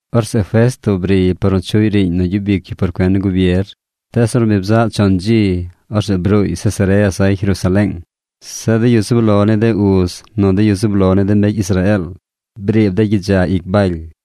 Orzeꞌ Festo briy par nu chuꞌy riiñ nu gyub ic yu por cuen ni gubier. Tees ornu bi bzaꞌ chon dzi, orzeꞌ bruuy Cesarea zay Jerusaleeng. Zeꞌ de yu zub lo ni de uz nu de yu zub lo ni de mbecy Israeel briib dey gyidza ic Baly.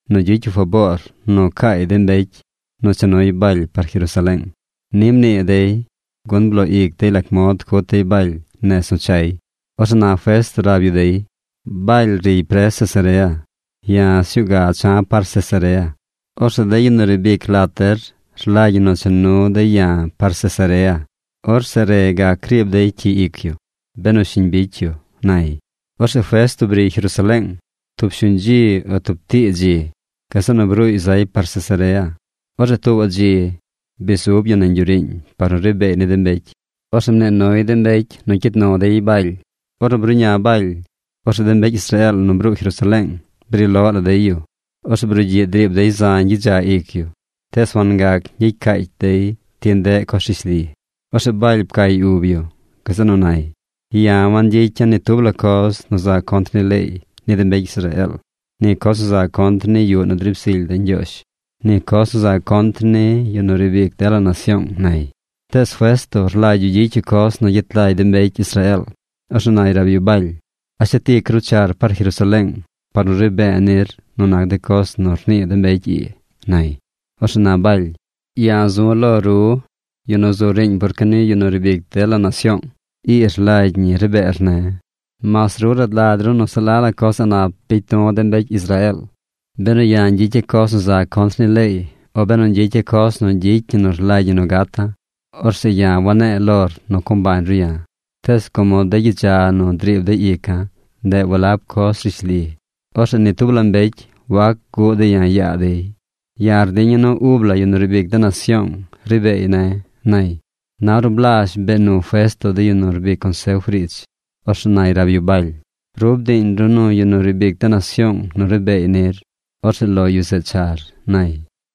nu gyicy yu faboor nu caay de mbecy nu cha nuy Baly par Jerusaleeng. Ni mnii dey gun bloo ic dey lac mod cut dey Baly nez nu chay. Orzeꞌ na Festo rab yu dey: ―Baly riy pres Cesarea. Ya̱ sñuu ga cha̱ par Cesarea. Orzeꞌ de yu nu riib ic lat der rlagy ñi nu cha nu dey ya̱ par Cesarea. Orzeꞌ re gac riib dey cyi ic yu, benu shiñ bicy yu ―nay. Orzeꞌ Festo briy Jerusaleeng tub shuñ dzi o tub tii dzi. Gazeꞌ nu bruuy zay par Cesarea. Orzeꞌ tuubaꞌ dzi bi zub yu nañ yuꞌ riiñ par nu ri beey ni de mbecy. Orzeꞌ mnii nuy de mbecy nu cyid nu dey Baly. Ornu bruꞌña Baly, orzeꞌ de mbecy Israeel nu bruu Jerusaleeng bri loꞌ la dey yu. Orzeꞌ brugyiꞌ driib dey zañ gyidza ic yu tees wangac ñgyicy caacy dey ti ndeꞌ coz rishli. Orzeꞌ Baly pcay ub yu. Gazeꞌ nu nay: ―Ya̱ wangyicya̱ ni tub la coz nu za contr ni leey ni de mbecy Israeel, ni coz nu za contr ni yuꞌ nu driib zily de̱ Ñgyoozh, ni coz nu za contr ni yu nu riib ic dela nasyoong ―nay. Tees Festo rlagy yu gyicy yu coz nu gyet lagy de mbecy Israeel. Orzeꞌ nay rab yu Baly: ―¿A shet ic ru char par Jerusaleeng par nu ri be̱e̱ nir nu nac de coz nu rnii de mbecy ii? ―nay. Orzeꞌ na Baly: ―Ya̱ zu̱ lo ru, yu nu zu riiñ por cuen ni yu nu riib ic dela nasyoong. Ii rlagy ñi ri beer ne̱. Mas ru rad lagy ru nu se la la coz a̱ꞌ nap bicy du̱ de mbecy Israeel. Benu ya̱ ñgyicya̱ coz nu za contr ni leey o benu ñgyicya̱ coz nu gyicy ñi nu rlagy ñi nu gata̱, orzeꞌ ya̱ wane̱e̱ lor nu co mbañ ru ya̱. Tees como de gyidza nu driib dey ica̱, ndeꞌ walab coz rishli, orzeꞌ ni tub la mbecy wac guꞌ dey ya̱ yaa dey. Ya̱ rdiña̱ nu ub la yu nu riib ic de nasyoong ri beey ne̱ ―nay. Na ornu blazh bee nu Festo de yu nu rbic consef riidz, orzeꞌ nay rab yu Baly: ―Ru bdiiñ ru nu yu nu riib ic de nasyoong nu ri beey nir. Orzeꞌ lo yu zeꞌ char ―nay.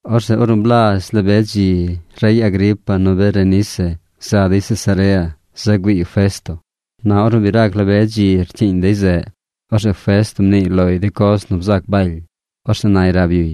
Orzeꞌ ornu blazh la be dzi rey Agripa nu Berenice za dey Cesarea za güiiy Festo. Na ornu bi rac la be dzi rcyiiñ dey zeꞌ, orzeꞌ Festo mniiy loy de coz nu bzac Baly. Orzeꞌ nay rab yuy: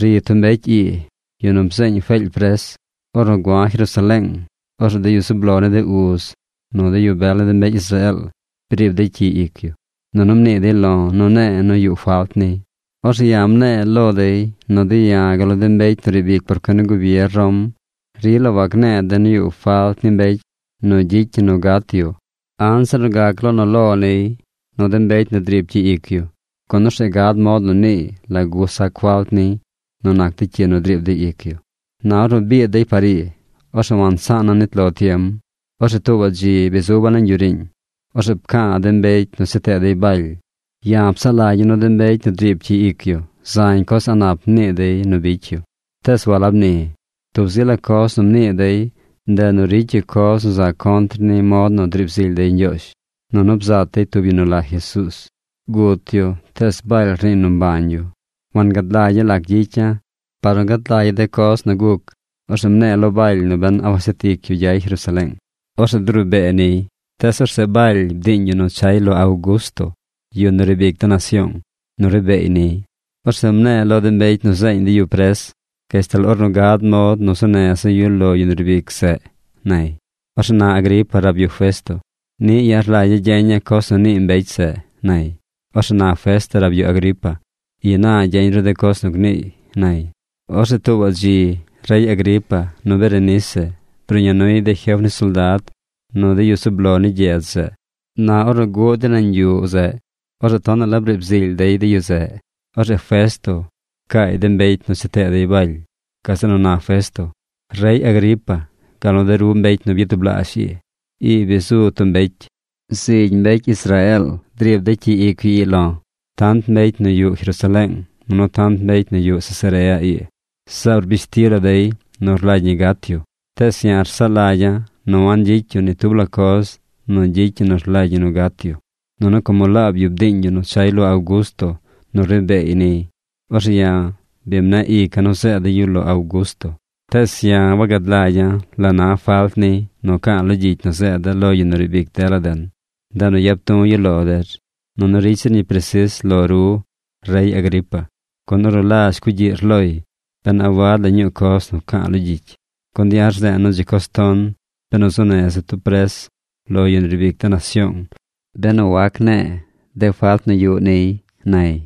―Ri tub mbecy ii, yu nu bzeeñ Feely pres. Ornu gua̱ Jerusaleeng, orzeꞌ de yu zub lo ni de uz nu de yu bel ni de mbecy Israeel briib dey cyi ic yu, nunu mnii dey lo̱ nu ne̱e̱ nu yuꞌ falt niy. Orzeꞌ ya̱ mne̱e̱ lo dey nu de̱ ya̱ gal nu de mbecy nu riib ic por cuen ni gubier Rom rila wagne̱e̱ de̱ nu yuꞌ falt ni mbecy nu gyicy ñi nu gat yu anzir nu gac lo nu lo niy nu de mbecy nu driib cyi ic yu, gun orzeꞌ gad mod nu niiy lagu sac falt niy nu nac de cyi nu driib dey ic yu. Na ornu biid dey par ii, orzeꞌ wansaana̱ nit lo tiem. Orzeꞌ tuubaꞌ dzi bi zuba̱ nañ yuꞌ riiñ. Orzeꞌ pca̱a̱ de mbecy nu cha tee dey Baly. Ya̱ psaꞌ lagya̱ nu de mbecy nu driib cyi ic yu zañ coz a̱ꞌ nap nii dey nu bicy yu. Tees walab ni. Tub zi la coz nu mnii dey, ndeꞌ nu ricy yu coz nu za contr ni mod nu driib zily dey Ñgyoozh, nunu bzat dey tub yu nu la Jesuuz. Gut yu tees Baly rniiy nu mbañ yu. Wangad lagya̱ lac gyicya̱ par nu gad lagya̱ de coz nu guc. Orzeꞌ mne̱e̱ lo Baly nu ben a washet ic yu gyay Jerusaleeng. Orzeꞌ zeꞌ duri be̱e̱ niy. Tees orzeꞌ Baly bdiiñ yu nu chay lo Augusto, yu nu riib ic de nasyoong, nu ri beey niy. Orzeꞌ mne̱e̱ lo de mbecy nu zeeñ dey yu pres gashtal ornu gad mod nu zuu neza̱ yu lo yu nu riib ic zeꞌ ―nay. Orzeꞌ na Agripa rab yu Festo: ―Niꞌ ya̱ rlagya̱ gyeña̱ coz nu nii mbecy zeꞌ ―nay. Orzeꞌ na Festo rab yu Agripa: ―Ina gyeñ ru de coz nu gniiy ―nay. Orzeꞌ tuubaꞌ dzi rey Agripa nu Berenice bruꞌña nuy de jef ni soldad nu de yu zub lo ni gyedz zeꞌ. Na ornu guꞌ dey nañ yuꞌ zeꞌ, orzeꞌ tonaꞌ la briib zily dey de yu zeꞌ. Orzeꞌ Festo pcaay de mbecy nu cha tee dey Baly. Gazeꞌ nu na Festo: ―Rey Agripa gal nu de ru mbecy nu byatublaazh ii. Ii bi zu tub mbecy. Zigy mbecy Israeel driib dey cyi ic yu ii lo̱: tant mbecy nu yuꞌ Jerusaleeng, nunu tant mbecy nu yuꞌ Cesarea ii. Zaab rbish ti la dey nu rlagy ñi gat yu. Tees ya̱ rsaꞌ lagya̱ nu wangyicy yu ni tub la coz nu gyicy ñi nu rlagy ñi nu gat yu. Nunu como laab yu bdiiñ yu nu chay lo Augusto nu ri beey niy, orzeꞌ ya̱ bi mneꞌ ica̱ nu zeeda̱ yu lo Augusto. Tees ya̱ wagad lagya̱ la na falt niy nu ca̱a̱ lo gyicy nu zeeda̱ lo yu nu riib ic dela den. Ndeꞌ nu yap du̱ yu lo der. Nunu ricy zir ñi presis lo ru, rey Agripa, gun ornu lazh cugyiꞌr loy ben a wad la ñuu coz nu ca̱a̱ lo gyicy. Gun ya̱ rze̱e̱ nu dzi coz ton benu zuu neza̱ tub pres lo yu nu riib ic de nasyoong benu wagac ne̱e̱ de falt nu yuꞌ niy ―nay.